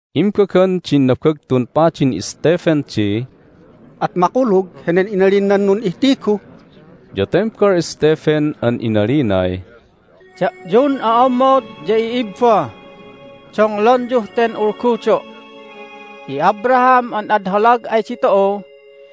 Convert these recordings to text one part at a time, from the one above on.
Imbagan din Nabagtun Padin Stephen di, "At makulug henen inalin nan nun'ihtigu?" Ya tembal Stephen an inalinay, "Da'yun o'ommod ya i'ibba, donglonyuh ten ulgudo'. Hi Abraham an ad holag ay ditu'u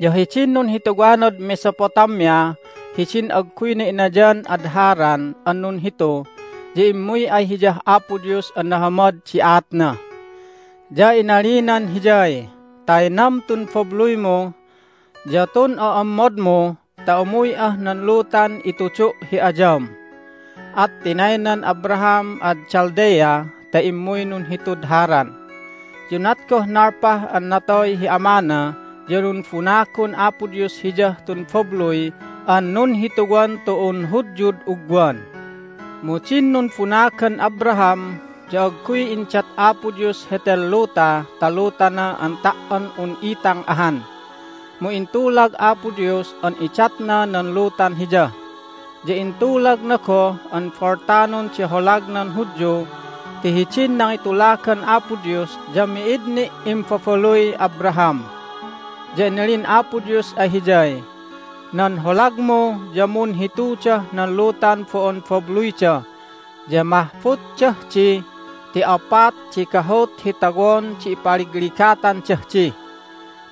ya hidin nunhituwanad Mesopotamia hidin agguyna inayan ad Haran an nunhitu ya immuy ay hiyah Apo Dios an nahamad di aatna. Ya inalinan hiyay, Taynam tun babluymu ya tun o'ommodmu ta umuy'ah nan lutan itudu' hi ayam. At tinaynan Abraham ad Chaldea ta immuy nunhitud Haran. Ya unat goh nalpah an natoy hi amana ya numbunagon Apo Dios hiyah tun babluy an nunhituwan tu'un Hudyud ugwan. Mu din numbunagan Abraham ya agguy indat Apo Dios heten luta ta lutana an ta"on un itang ahan, mu intulag Apo Dios an idatna nan lutan hiya. Ya intulagna goh an boltanon di holagnan Hudyu ti hidin nangitulagan Apo Dios ya mi'id ni' imbabaluy Abraham. Ya inalin Apo Dios ay hiyay, Nan holagmu ya munhitudah nan lutan bo'on babluyda, ya mahbutdah di ti opat di gahut hi tawon di ipaligligatandah di.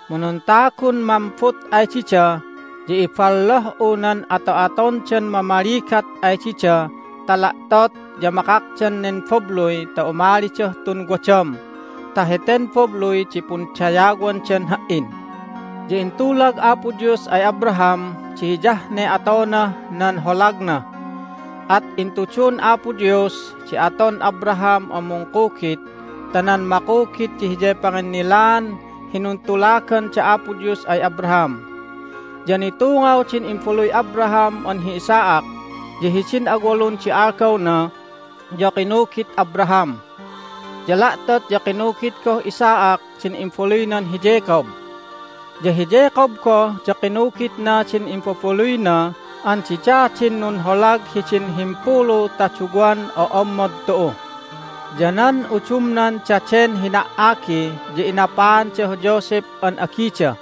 Mu nan tagun mambut ay dida ya ibolloh'u nan ato'atondan mamaligat ay dida ta la'tot ya makakdan nen babluy ta umalidah tun wadam, ta heten babluy di pundayawandan Ha"in. Ya intulag Apo Dios ay Abraham di hiyah ne atonah nan holagna, at intudun Apo Dios di aton Abraham an mungkugit ta nan makugit di hiyay panginnilaan hi nuntulagan da Apo Dios ay Abraham. Ya nitungaw din imbaluy Abraham an hi Isaac, ya hidin awalun di algawna ya kinugit Abraham. Ya la'tot ya kinugit goh Isaac din imbaluynan hi Jacob. Ya hi Jacob goh ya kinugitna din imbabaluyna an dida din nunholag hidin himpulu ta duwan o'ommod tu'u. Ya nan udumnan daden hina"agi ya inapaandah Joseph an agida,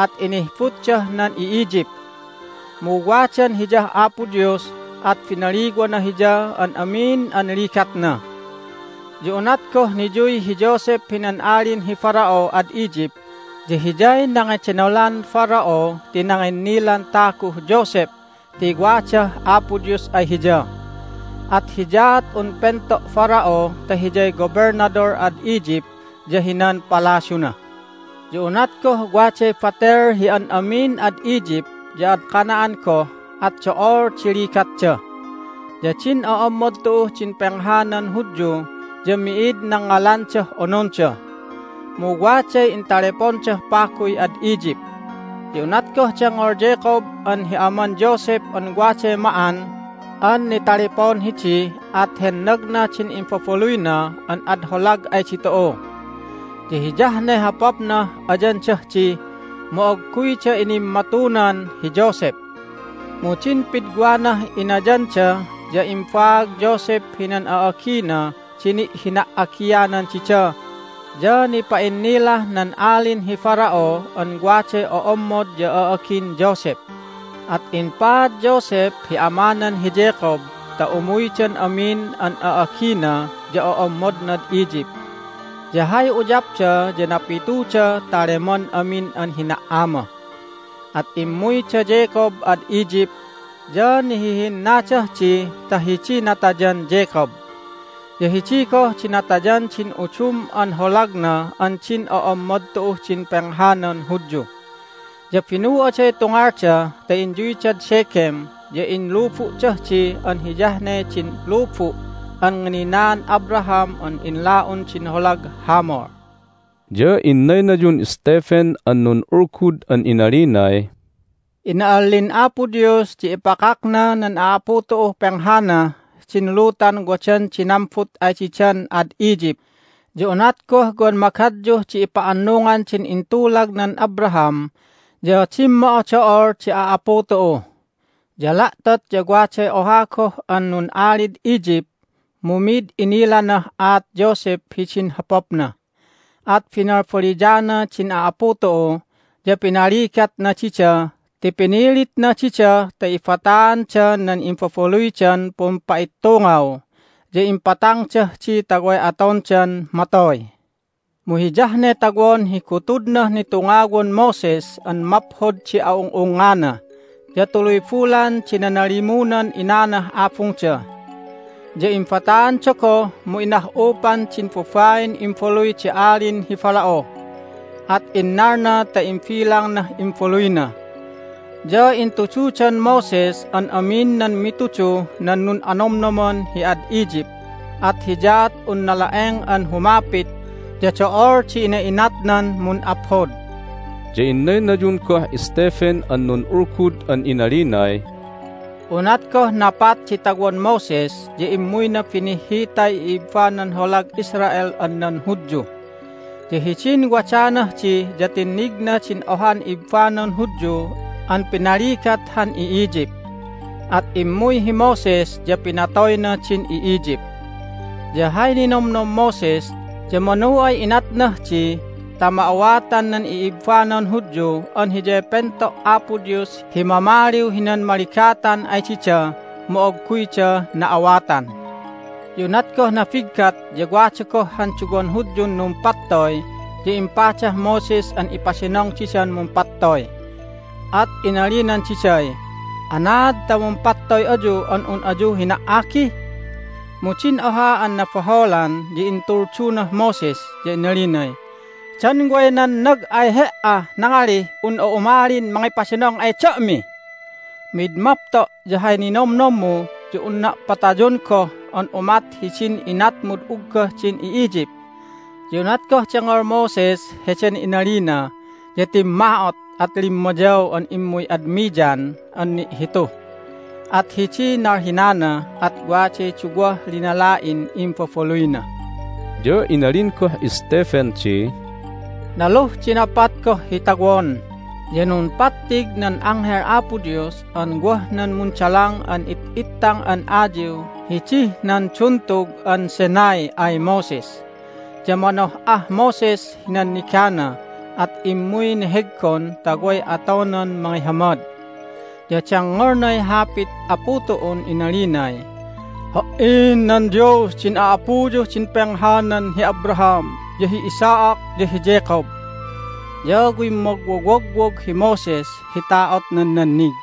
at inihbutdah nan i'Egypt. Mu wadan hiyah Apo Dios, at binaliwana hiyah an amin an ligatna. Ya unat goh niyuy hi Joseph hinan Alin hi Pharaoh ad Egypt ya hiyay nangedenolan Pharaoh ti nanginnilan taguh Joseph ti wadah Apo Dios ay hiya. At hiyaat un pento' Pharaoh ta hiyay gobelnadol ad Egypt ya hinan palasyuna. Ya unat goh waday batel hi an amin ad Egypt ya ad Canaan goh at do'ol di ligatda. Ya din o'ommod tu'uh din penghanan Hudyu ya mi'id nangngalandah ononda. Mu waday intalepondah paguy ad Egypt. Ya unat goh dengngol Jacob an hi aman Joseph an waday ma'an an nitalepon hidi at hennagna din imbabaluyna an ad holag ay ditu'u. Ya hiyah ne hopapnah ayandah di, mu agguyda inimmatunan hi Joseph. Mu din pidwanah inayanda ya imbaag Joseph hinan a'agina di ni'hina"agianan dida, ya nipa'innilah nan Alin hi Pharaoh an waday o'ommod ya a'agin Joseph. At impaad Joseph hi amanan hi Jacob ta umuydan amin an a'agina ya o'ommodnad Egypt. Ya hay uyapda ya napituda ta leman amin an hina"ama. At immuy da Jacob ad Egypt, ya nihihinnadah di ta hidiy natayan Jacob. Ya hidi goh di natayan din udum an holagna an din o'ommod tu'uh din penghanan Hudyu. Ya binu'aday tungalda ta inyuydad Shechem, ya inlubu'dah di an hiyah ne din lubu' an ngininaan Abraham an inla'un din holag Hamor." Ya inaynayun Stephen an nun'ulgud an inalinay, "Ina'allin Apo Dios di ipakakna nan a'apu tu'uh penghanah din lutan wadan di nambut ay didan ad Egypt, ya unat goh wan magadyuh di ipa'annungan din intulagnan Abraham ya dimmo'odo'ol di a'apu tu'u. Ya la'tot ya waday oha goh an nun'alid Egypt, mu mi'id inilanah aat Joseph hidin hopapna. At binalbaliyana din a'apu tu'u, ya pinaligatna dida ti pinilitna dida ta ibataanda nan imbabaluydan pumpa'ittungaw, ya impatangdah di ta way atondan matoy. Mu hiyah ne tawon hi gutudnah nitungawan Moses an maphod di a'ung'ungngana, ya tuluy bulan di nanalimunan inanah abungda. Ya imbataanda goh, mu inah'upan din babain imbaluy di Alin hi Pharaoh, at innalna ta imbilangnah imbaluyna. Ya intududan Moses an amin nan mituduh nan nun'anomnoman hi ad Egypt, at hiyaat un nala'eng an humapit, ya do'ol di ina'inatnan mun'aphod." Ya innaynayun goh Stephen an nun'ulgud an inalinay, "Unat goh napat di tawon Moses ya immuyna binihhitay i'ibbanan holag Israel an nan Hudyu. Ya hidin wadanah di ya tinnigna din ohan ibbanan Hudyu an pinaligat han i'Egypt. At immuy hi Moses, ya pinatoyna din i'Egypt. Ya hay ninomnom Moses ya manu ay inatnah di ta ma'awatan nan i'ibbanan Hudyu an hiyay pento' Apo Dios hi mamaliw hinan maligatan ay dida, mu agguyda na'awatan. Ya unat goh nabiggat ya wada goh han duwan Hudyun numpattoy, ya impadah Moses an ipadinong didan mumpattoy, at inalinan diday, Anaad ta mumpattoy ayu an un ayu hina"agi? Mu din oha an nabaholan ya intuldunah Moses, ya inalinay, Dan way nannag ay he"ah nangalih un'a umalin mangipadinong ay da'mi? Mid mapto' ya hay ninomnommu ya unna' patayon goh an umat hidin inatmud uggah din i'Egypt! Ya unat goh dengngol Moses heden inalina ya timma'ot, at limmayaw an immuy ad Midian an ni'hitu. At hidiy nalhinana, at waday duwah linala'in imbabaluyna." Ya inalin goh Stephen di, "Naluh di napat goh hi tawon ya numpattig nan Anghel Apo Dios an wah nan mundalang an it'itang an ayiw hidih nan Duntug an Sinai ay Moses. Ya manoh'ah Moses hi nannigana, at immuy neheggon ta way atonan mangihamad. Ya dengngolnay hapit Apu tu'un inalinay, Ha"in nan Dios din a'apuyuh din penghanan hi Abraham, ya hi Isaac, ya hi Jacob. Ya wimmogwowogwog hi Moses hi ta'otnan nannig.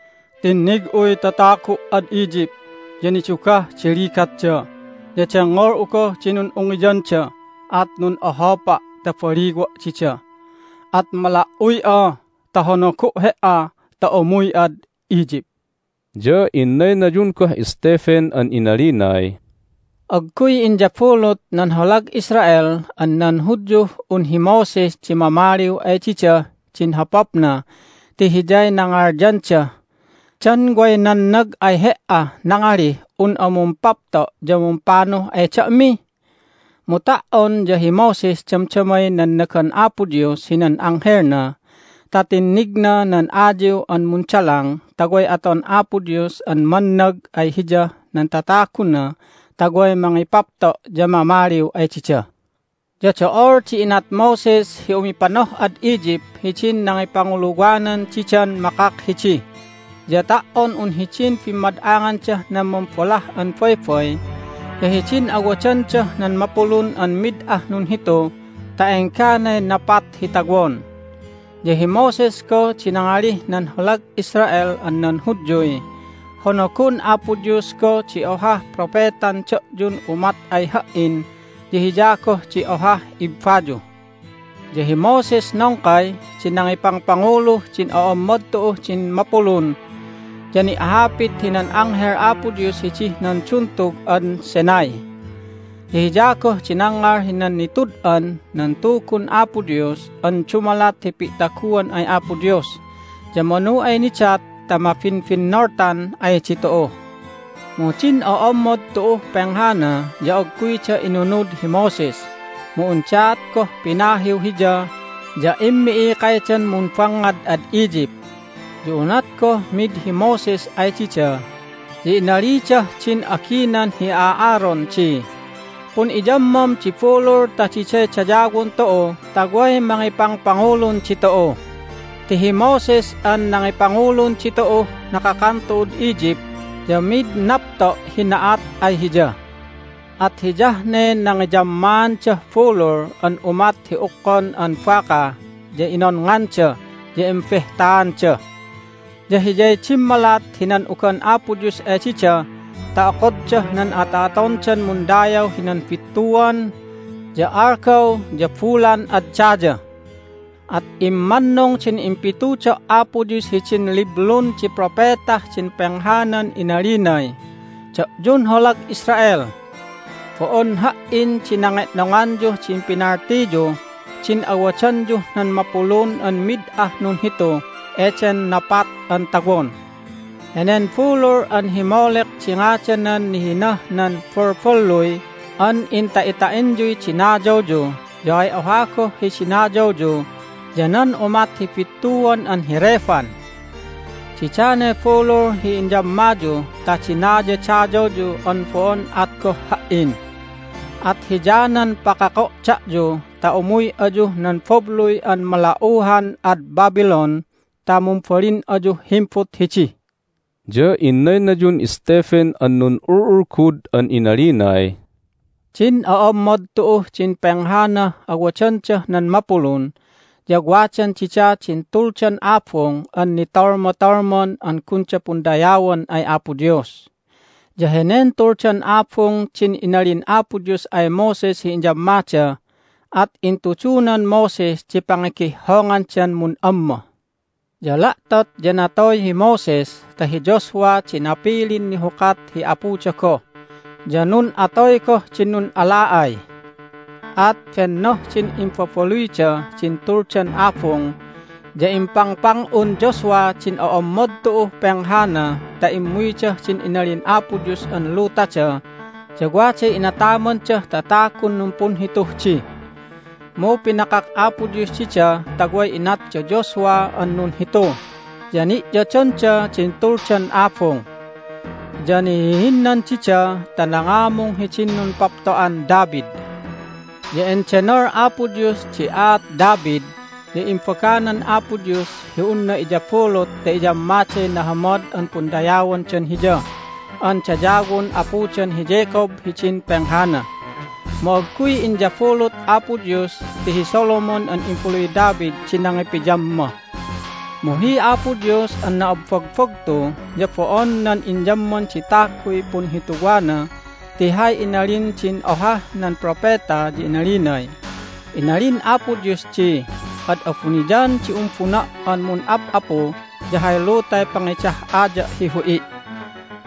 Tinnig'uy tatagu' ad Egypt, ya nidugah di ligatda, ya dengngol'u goh di nun'ungiyanda, at nun'ohopa' ta baliwa' dida. At mala"uy'a ta honogo' he"a ta umuy'ad Egypt." Ya inaynayun goh Stephen an inalinay, "Agguy inyabulut nan holag Israel an nan Hudyuh un hi Moses di mamaliw ay didah din hopapna ti hiyay nangalyandah, Dan way nannag ay he"ah nangalih un'a mumpapto' ya mumpanuh ay da'mi? Mu ta"on ya hi Moses damdamay nannagan Apo Dios hinan Anghelna ta tinnignah nan ayiw an mundalang ta way aton Apo Dios an mannag ay hiyah nan tataguna ta way mangipapto' ya mamaliw ay dida. Ya do'ol di inat Moses hi umipanoh'ad Egypt hidin nangipanguluwanan didan makak hidi, ya ta"on un hidin bimmad'angandah nan Mumbolah an Baybay, ya hidin awadandah nan mapulun an mid ah nunhitu ta engganay napat hi tawon. Ya hi Moses goh di nangalih nan holag Israel an nan Hudyuy, Honogon Apo Dios goh di ohah Propetan da'yun umat ay ha"in, ya Hiya goh di ohah ibbayu. Ya hi Moses nongkay di nangipangpanguluh din o'ommod tu'uh din mapulun, ya ni'hapit hinan Anghel Apo Dios hidih nan Duntug an Sinai. Ya hiya goh di nangngal hinan nitud'an nan Tugun Apo Dios an dumalat hi pi'taguan ay Apo Dios, ya manu ay nidat ta mabinbinnoltan ay ditu'u. Mu din o'ommod tu'uh penghana ya agguyda inunud hi Moses, mu undaat goh pinahiw hiya, ya immi'ikaydan mumbangngad ad Egypt. Ya unat goh mid hi Moses ay dida ya inalidah din aginan hi Aaron di, Pun'iyammam di bulul ta diday dayawon tu'u ta way mangipangpangulun ditu'u. Ti hi Moses an nangipangulun ditu'uh nakakan tu'ud Egypt ya mid napto' hi na'at ay hiya. At hiyah ne nangiyammaandah bulul an umat hi ukkon an baka, ya inonnganda, ya imbehtaanda. Ya hiyay dimmalat hi nan'ugan Apo Dios ay dida ta okoddah nan ato'atondan mundayaw hinan bittuan, ya algaw, ya bulan ad daya. At immannung din impitudo' Apo Dios hidin liblun di propetah din penghanan inalinay, Da'yun holag Israel! Bo'on Ha"in di nange'nonganyuh din pinaltiyuh din awadanyuh nan mapulun an mid ah nunhitu eden napat an tawon. Henen bulul an hi Molek di ngadanan nihinah nan balballuy an inta'ita'inyuy dinayawyu, ya hay oha goh hi dinayawyu ya nan umat hi bittuan an hi Rephan! Didanay bulul hi inyammayu ta dinayadayawyu an bo'on at goh Ha"in. At hiyanan pakako' da'yu ta umuy ayuh nan babluy an malauhan ad Babylon ta mumbalin ayuh himbut hidi." Ya inaynayun Stephen an nun'ul'ulgud an inalinay, "Din o'ommod tu'uh din penghanah awadandah nan mapulun ya wadan dida din Tuldan Abung an nitolmatolman an gunda pundayawan ay Apo Dios. Ya henen Tuldan Abung din inalin Apo Dios ay Moses hi iyammada, at intudunan Moses di pangigihhongandan mun'amma. Ya la'tot ya natoy hi Moses ta hi Joshua di napilin nihukat hi apuda goh, ya nun'atoy goh din nun'ala'ay. At bennoh din imbabaluyda din Tuldan Abung, ya impangpang'un Joshua din o'ommod tu'uh penghana ta immuydah din inalin Apo Dios an lutada, ya waday inatamandah tatagun numpunhituh di. Mu pinakak Apo Dios dida ta way inat da Joshua an nunhitu, ya ni'yodonda din Tuldan Abung. Ya nihihinnan dida ta nangamung hidin numpapto'an David. Ya endenol Apo Dios di aat David, ya imbaganan Apo Dios hi unna iyabulut ta iyammaday nahamad an pundayawandan Hiya an dayawon apudan hi Jacob hidin penghana. Mu agguy inyabulut Apo Dios ti hi Solomon an imbaluy David di nangipiyamma. Mu hi Apo Dios an na'abbagbagtu ya bo'on nan inyamman di taguy punhituwana, ti hay inalin din ohah nan propeta ya inalinay, Inalin Apo Dios di, Ad abuniyan di umbuna' an mun'ap'apu, ya hay lutay pangidah'aya' hi hu'i'.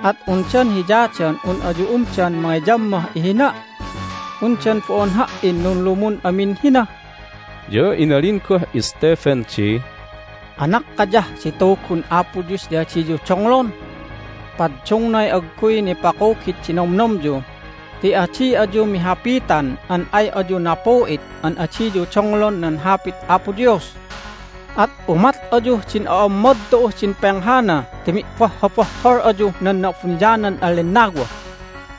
At undan hiyadan un ayu umdan mangiyammah ihina'? Undan bo'on Ha"in nunlumun amin hina?" Ya inalin goh Stephen di, "Anakkayah di Tugun Apo Dios ya adiyu donglon! Paddungnay agguy nipakugit di nomnomyu ti adi ayu mihapitan an ay ayu napu'it an adiyu donglon nan Hapit Apo Dios! At umat ayuh din o'ommod tu'uh din penghana ti mi'bohhobohhol ayuh nan Na'abuniyanan an Lennawa!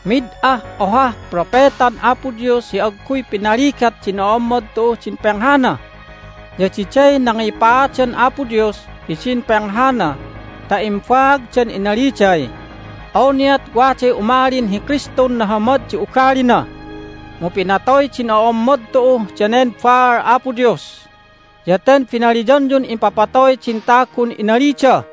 Mid ah ohah propetan Apo Dios hi agguy pinaligat din o'ommod tu'uh din penghana! Ya diday nangipaadan Apo Dios hidin penghana ta imbaagdan inaliday, Awniat waday umalin hi Kristun nahamad di ugalina! mu pinatoy din o'ommod tu'u danen baal Apo Dios! Ya ten binaliyanyun impapatoy din tagun inalida!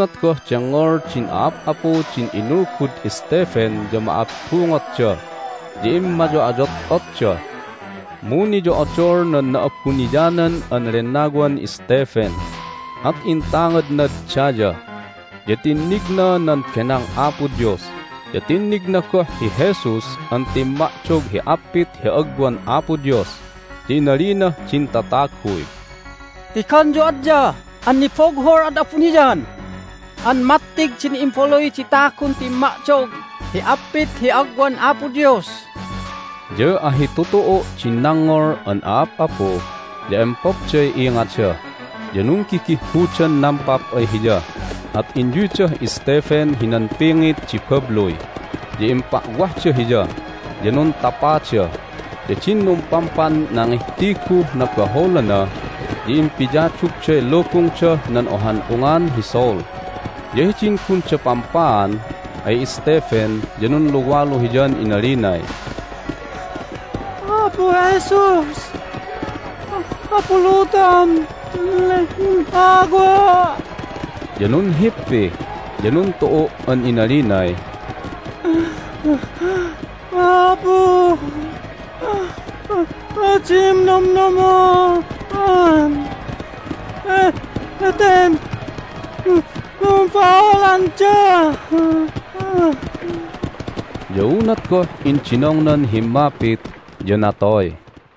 Unat goh dengngol din a'ap'apu din inulgud Stephen ya ma'abbungotda, ya immayo'ayot'otda. Mu niyo'odol nan Na'abuniyanan an Lennawan Stephen, at intangadnad daya, ya tinnigna nan benang Apo Dios, ya tinnigna goh hi Jesus an timma'dog hi appit hi agwan Apo Dios. Ya inalinah din tataguy, "Tigonyu adya an nibughul ad abuniyan an mattig din Imbaluy di Tagun timma'dog hi appit hi agwan Apo Dios!" Ya ahitutu'u' din nangngol an a'ap'apu, ya empopday ingada, ya nunggigihhudan nampap ay hiya. At inyuydah Stephen hinan pingit di babluy, ya impa'wahda hiya, ya nuntapada. Ya din numpampan nangihtiguh nabaholana ya impiyadugday lubungdah nan ohan ungan hi Saul. Ya hidin gunda pampaan ay Stephen ya nunluwalu hiyan inalinay, "Apu Jesus, abulutom tun lennawa'!" Ya nunhippi, ya nuntu'u' an inalinay, "Apu! Adim nomnomon heten numbaholanda!" Ya unat goh indinongnan himmapit ya natoy.